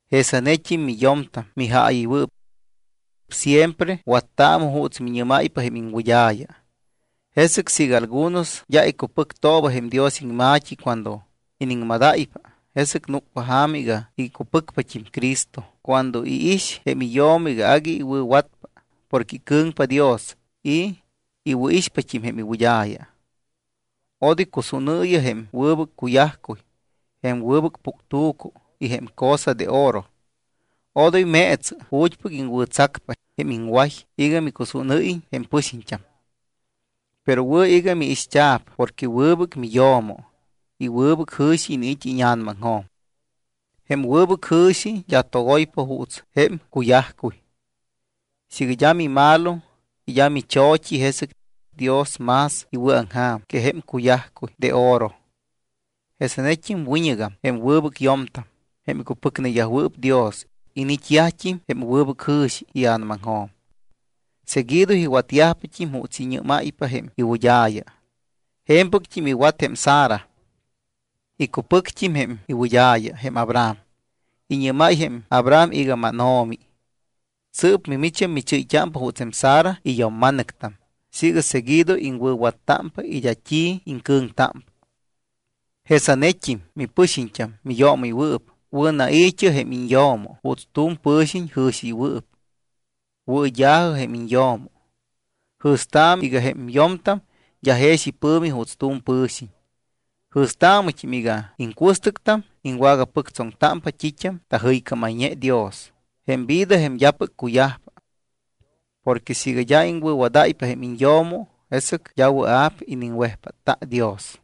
Jesanet́im miyo̱mtam mijaayɨywɨɨp. Siempre wattaamɨ juuts miñɨ́máypa jém iŋwɨd́a̱ya. Jesɨc siiga algunos d́a icupɨctooba jém Dios iŋma̱t́i cuando iniŋmadáypa, jesɨc núcpa ja̱ma iga icupɨcpat́im Cristo cuando iix jém iyo̱mo iga agui iwɨ̱watpa porque icɨ̱ŋpa Dios y iwɨ̱ixpat́im jém iwɨd́a̱ya. Odoy cusúnɨɨyɨ jém wɨbɨc cuyajcuy, jém wɨbɨc puctu̱cu y jém cosa de oro. Odoy meetsɨ ju̱t́pɨc iŋwɨ̱tsacpa jém iŋway iga micusúnɨ́yiñ jém pɨxiñt́am. Pero wɨ̱ iga miixt́a̱p porque wɨbɨc miyo̱mo y wɨbɨc jɨ̱xi iniit́ íña̱namaŋjo̱m. Jém wɨbɨc jɨ̱xi d́a togoypa juuts jém cuyajcuy. Siiga d́a mimalo y d́a micho̱t́i, jesɨc Dios más iwɨ̱aŋja̱m que jém cuyajcuy de oro. Jesanet́im wiñɨgam jém wɨbɨc yo̱mtam, jém icupɨcneyajwɨɨp Dios, iniit́yajt́im jém wɨbɨc jɨ̱xi ia̱namaŋjo̱m. Seguido iwatyajpat́im juuts iñɨ́máypa jém iwɨd́a̱ya. Je̱mpɨct́im iwat jém Sara. Icupɨct́im jém iwɨd́a̱ya jém Abraham. Iñɨ́máy jém Abraham iga: Máno̱mi. Sɨɨp mimicht́am michɨ́yt́ámpa juuts jém Sara iyo̱mma̱nɨctam siiga seguido iŋwɨ̱wattámpa y d́a t́i iŋcɨ̱ŋtámpa. Jesanet́im mipɨxiñt́am miyoomɨywɨɨp, wɨ̱nai̱t́ɨ jém iñyo̱mo juuts tu̱m pɨ̱xiñ jɨ̱xiɨywɨɨp. Wɨɨd́a̱jɨ jém iñyo̱mo. Jɨ̱staamɨ iga jém yo̱mtam d́a jex ipɨ̱mi juuts tu̱m pɨ̱xiñ. Jɨ̱staamɨt́im iga iŋcuɨstɨctam iŋwagapɨctsoŋtámpa t́it́am tajɨycámayñe Dios, jém vida jém d́apɨc cuyajpa. Porque siiga d́a iŋwɨ̱wadáypa jém iñyo̱mo, jesɨc d́a wɨa̱p iniŋwejpátta Dios.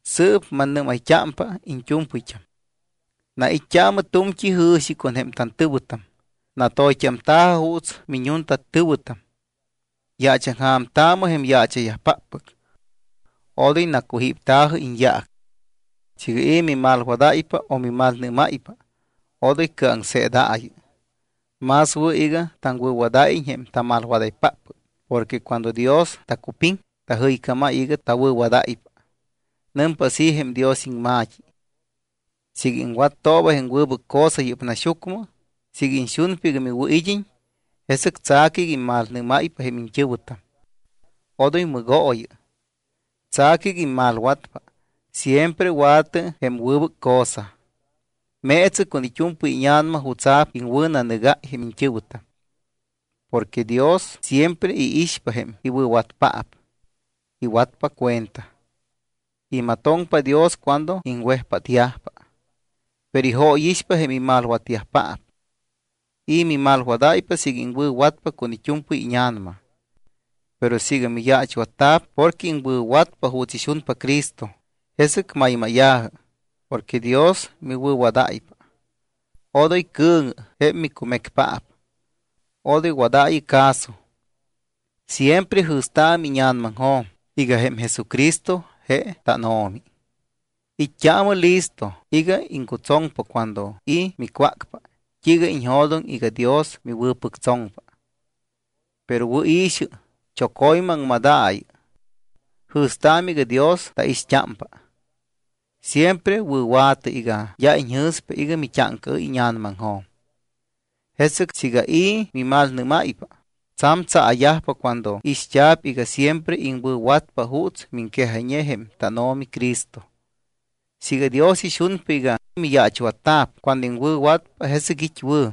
Sɨɨp mannɨ́mayt́ámpa iñt́u̱mpɨyt́am. Nait́t́aamɨ tu̱mt́i jɨ̱xi con jém tantɨ̱wɨtam, natoyt́amta̱jɨ juuts miñuntatɨ̱wɨtam. Yaachaŋja̱mtaamɨ jém yaacha̱yajpáppɨc. Odoy nacujípta̱jɨ iñyaac. Siiga i̱ mimalwadáypa o mimalnɨ́máypa, odoy cɨaŋseedaayɨ. Más wɨ̱ iga taŋwɨ̱wadáyiñ jém tamalwadaypáppɨc porque cuando Dios tacupiŋ, tajɨycámáy iga tawɨ̱wadáypa. Nɨmpa así jém Dios iŋma̱t́i: Siiga iŋwattooba jém wɨbɨc cosa yɨ́p naxyucmɨ, siiga iñxunpa iga miwɨ̱id́iñ, jesɨc tsa̱cɨ iga immalnɨ́máypa jém iñt́ɨ̱wɨtam. Odoy mɨgooyɨ. Tsa̱cɨ iga immalwatpa, siempre wa̱tɨ jém wɨbɨc cosa. Meetsɨ con it́u̱mpɨy íña̱nama jutsa̱p iŋwɨ̱nanɨgáy jém iñt́ɨ̱wɨtam. Porque Dios siempre iixpa jém iwɨ̱watyajpaap. Iwatpa cuenta. Imatoŋpa Dios cuando iŋwejpátyajpa. Pero ijóyixpa jém imalwatyajpaap. ¿I̱ mimalwadáypa siiga iŋwɨ̱watpa con it́u̱mpɨy íña̱nama? Pero siiga miyaachwatta̱p porque iŋwɨ̱watpa juuts ixunpa Cristo, jesɨc maymáya̱jɨ porque Dios miwɨ̱wadáypa. Odoy cɨ̱ŋɨ jém micumecpaap. Odoy wadaayɨ caso. Siempre jɨ̱staamɨ íña̱namaŋjo̱m iga jém Jesucristo je tánO̱mi. It́t́aamɨ listo iga iŋcutsoŋpa cuando i̱ micwácpa t́iiga iñjo̱doŋ iga Dios miwɨ̱pɨctsoŋpa. Pero wɨ̱i̱xɨ, choco̱ymɨ aŋmadaayɨ. Jɨ̱staamɨ iga Dios taixt́ámpa. Siempre wɨ̱wa̱tɨ iga d́a iñjɨ̱spa iga mit́áŋcaɨ́y íña̱namaŋjo̱m. Jesɨc siiga i̱ mimalnɨ́máypa, tsa̱m tsaa̱yajpa cuando ixt́a̱p iga siempre iŋwɨ̱watpa juuts miŋquejayñe jém tánO̱mi Cristo. Siiga Dios ixunpa iga miyaachwatta̱p cuando iŋwɨ̱watpa, jesɨc it́ wɨ̱.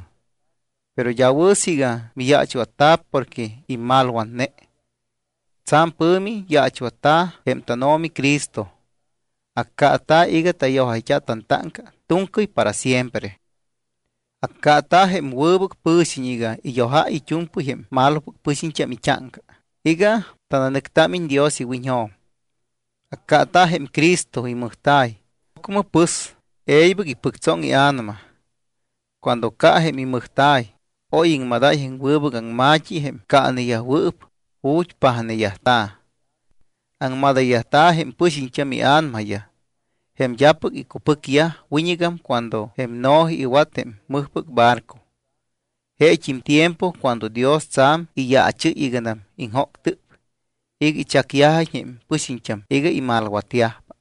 Pero d́a wɨ̱ siiga miyaachwatta̱p porque immalwatne. Tsa̱m pɨ̱mi yaachwatta̱ jém tánO̱mi Cristo. Accaata̱ iga tayojayt́a tantáŋca tu̱ŋcɨy para siempre. Accaata̱ jém wɨbɨc pɨ̱xiñ iga iyojáy it́u̱mpɨy jém malopɨc pɨxiñt́am it́áŋca iga tananɨctamta̱iñ Dios iwiñjo̱m. Accaata̱ jém Cristo imɨjta̱y, ocmɨ pɨs, e̱ybɨc ipɨctsoŋ ia̱nama. Cuando ca jém imɨjta̱y, oy iŋmadáy jém wɨbɨc aŋma̱t́i jém caaneyajwɨɨp ju̱t́ pajneyajta̱. Aŋmadayyajta̱ jém pɨxiñt́am ia̱namayaj, jém d́apɨc icupɨcyaj wiñɨgam cuando jém Noé iwat jém mɨjpɨc barco. Jeet́im tiempo cuando Dios tsa̱m iyaachɨ́y iganam iŋjóctɨp iga ichacyajiñ jém pɨxiñt́am iga imalwatyajpa.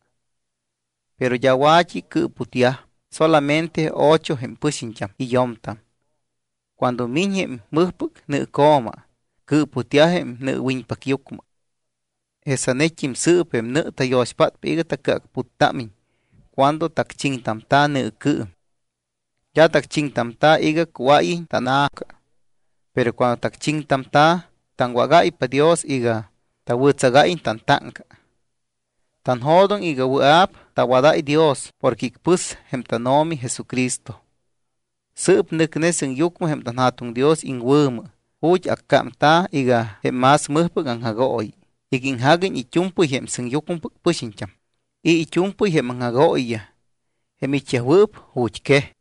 Pero d́a wa̱t́i cɨɨputyaj solamente ocho jém pɨxiñt́am y yo̱mtam. Cuando miñ jém mɨjpɨc nɨɨco̱ma, cɨɨputyaj jém nɨɨwiñpacyucmɨ. Jesanet́im sɨɨp jém nɨ tayo̱xpátpa iga tacɨacputtámiñ cuando tacchiŋtamta̱ nɨɨcɨɨm. D́a tacchiŋtamta̱ iga cuáyiñ tanna̱ca. Pero cuando tacchiŋtamta̱, taŋwágáypa Dios iga tawɨ̱tsagáyiñ tantáŋca. Tanjo̱doŋ iga wɨa̱p tawadáy Dios porque icpɨs jém tánO̱mi Jesucristo. Sɨɨp nɨcne sɨŋyucmɨ jém tanJa̱tuŋ Dios iŋwɨ̱mɨ ju̱t́ accámta̱ iga jém más mɨjpɨc aŋjagooyi iga iŋjaguiñ it́u̱mpɨy jém sɨŋyucmɨpɨc pɨxiñt́am y it́u̱mpɨy jém aŋjagooyiyaj, jém it́yajwɨɨp ju̱t́quej.